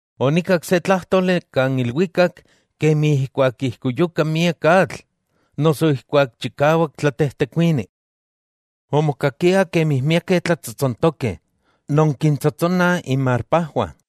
Onikak se tlájtoli kan ilwikak kemi ijkuak ijkuyuka miak atl noso ijkuak chikawak tlatejtekuini. Omokakia kemi miakeh tlatsotsonkeh kintsotsontoskiah inmarpajwah.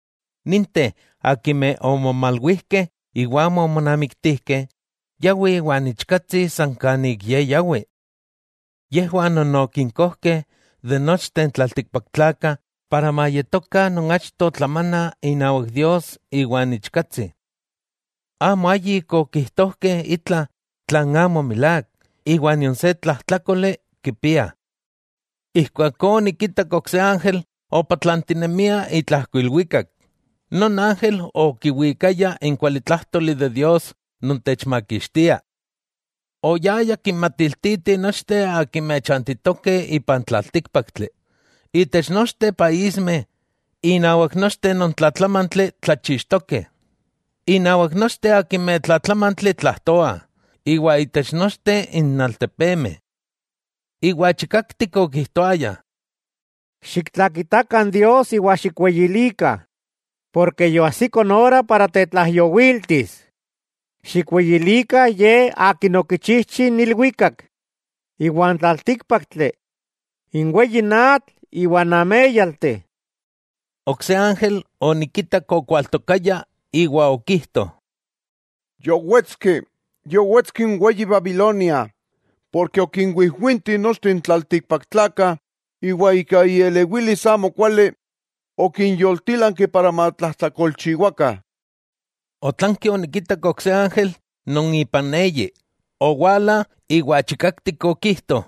Ninteh akimeh omomalwijkeh iwa amo omonamiktijkeh, yawih iwan Ichkatsi san kan ik Ye yawi. Yejwah non okinkojkeh itech nochteh n tlaltikpaktlakah para mayetokah non achto tlamana inawak Dios iwa n Ichkatsi. Amo ayik okijtojkeh itla tlan amo milák, iwa nion se tlajtlákoli kipiah. Ijkuakó onikitak ok se ángel opatlantinemia itlajko ilwikak. Non ángel okiwikaya n kualitlájtoli de Dios non techmakixtia. Oyaya kinmatiltiti nochteh akimeh chantitokeh ipan tlaltíkpaktli, itech nochteh paísmeh, innawak nochteh non tlatlamantli tlachixtokeh, innawak nochteh akimeh tlatlamantli tlajtoah, iwa itech nochteh n altepemeh, Iwa chikaktik okijtoaya: —Xiktlakitakah Dios iwa xikweyilikah, porke yoajsiko n ora tetlaijyowiltis. Xikweyilikah Ye akin okichijchi n ilwikak iwa n tlaltíkpaktli, n weyi atl iwa n améyalteh. Ok se ángel onikitak okualtokaya, iwa okijto: —Yowetski, yowetski n weyi Babilonia, ken okinwijwinti nochteh n tlaltikpaktlakah, iwa ika ielewilis amokuali okinyoltílanki para matlajtlakolchiwakah. Otlanki onikitak ok se ángel non ipan eyi, owala iwa chikaktik okijto: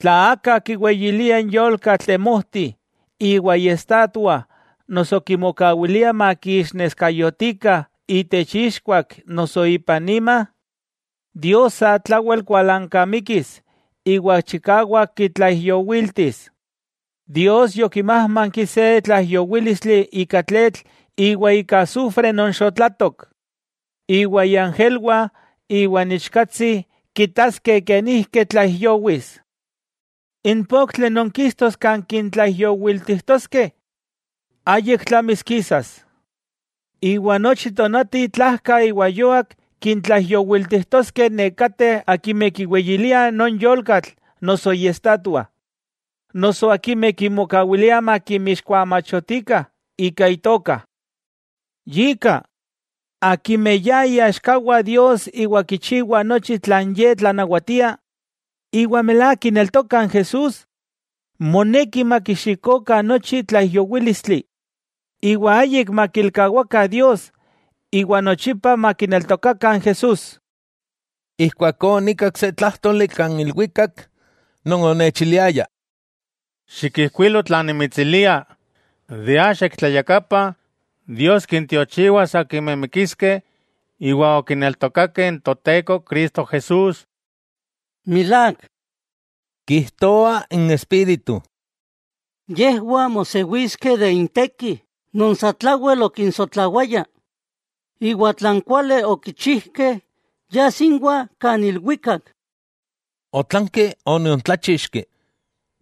—Tla aka kiweyilia n yolkatl temojti iwa iestatua noso kimokawilia makiixneskayotikah itech ixkuak noso ipan ima, Dios satlawel kualankamikis iwa chikawak kitlaijyowiltis. Dios yokimájmanki se tlaijyowílistli ika tletl iwa ika asufre non xotlatok. Iwa iangelwah iwa n Ichkatsi kitaskeh kenijki tlaijyowis. N poktli non kistos kan kintlaijyowiltijtoskeh, ayik tlamis kisas. Iwa nochi tonati tlajka iwa yuak kintlaijyowiltijtoskeh nekateh akimeh kiweyiliah non yolkatl noso iestatua, noso akimeh kimokawiliah makimixkuamachotikah ika itoka. Yika, akimeh ya iaxkawah Dios iwa kichiwah nochi tlan Ye tlanawatia, iwa milák kineltokah n Jesús, moneki makixikokah nochi tlaijyowílistli, iwa ayik makilkawakah Dios iwa nochipa makineltokakah n Jesús. Ijkuakó onikak se tlájtoli kan ilwikak, non onechaliliaya: —Xikijkuilo tlan nimitsilia: “Axa ik tlayakapa Dios kintiochiwas akimeh mikiskeh iwa okineltokakeh n Toteko Cristo Jesús.” —Milák, kijtoa n Espíritu—, yejwah mosewiskeh de intekih non satlawel okinsotlawaya. Iwa tlan kuali okichijkeh yas inwah kan ilwikak. Otlanki oniontláchixki,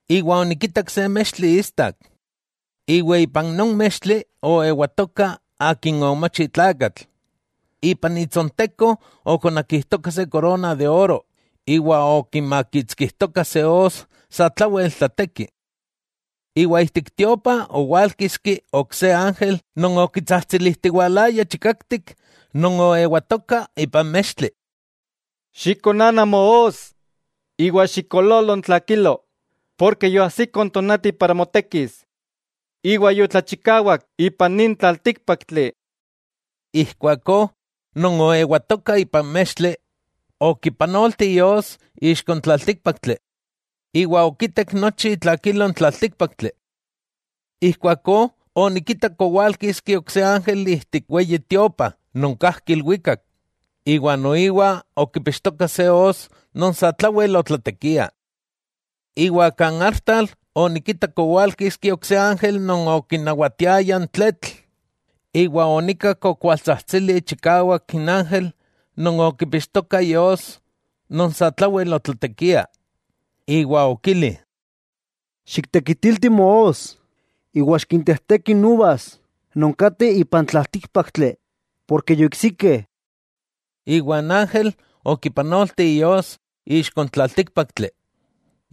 iwa onikitak se mextli istak. Iwa ipan non mextli oewatoka Akin omochi tlakatl. Ipan itsonteko okonakijtoka se korona de oro iwa okimakitskijtoka se os satlawel tlateki. Iwa ijtik tiopa owálkiski ok se ángel non okitsajtsilijtiwalaya chikaktik non oewatoka ipan mextli: —¡Xikonana moos iwa xikoololo n tlakilo, ken yoajsiko n tonati para motekis, iwa yotlachikawak ipan nin tlaltíkpaktli! Ijkuakó non oewatoka ipan mextli okipanolti ios ixko n tlaltíkpaktli, iwa okitek nochi itlakilo n tlaltíkpaktli. Ijkuakó onikitak owálkiski ok se ángel ijtik n Weyi Tiopa non kajki ilwikak, noiwa okipixtoka se os non satlawel otlatekia. Iwa kan artal onikitak owálkiski ok se ángel non okinawatiaya n tletl, iwa onikak okualtsajtsili chikawak n ángel non okipixtoka ios non satlawel otlatekia, iwa okili: —¡Xiktekitilti moos, iwa xikintejteki n uvas non kateh ipan tlaltíkpaktli, ken yoiksikeh! Iwa n ángel okipanolti ios ixko n tlaltíkpaktli,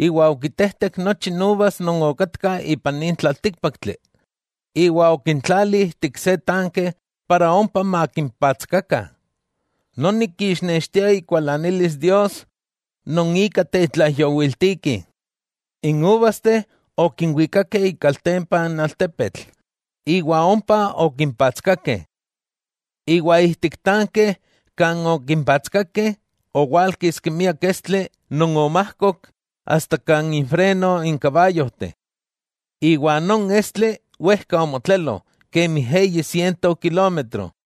iwa okitejtek nochi n uvas non okatka ipan nin tlaltíkpaktli, iwa okintlali ijtik se tanke para ompa makimpatskakah. Noni kixnextia ikualanilis Dios non ika tetlaijyowiltiki. N uvasteh okinwikakeh ikaltempa n altepetl iwa ompa okimpatskakeh. Iwa ijtik tanke kan okimpatskakeh, owálkiski miak estli non omajkok asta kan infreno n kabayojteh. Iwa non estli wejka omotlelo, kemi eyi siento kilómetro.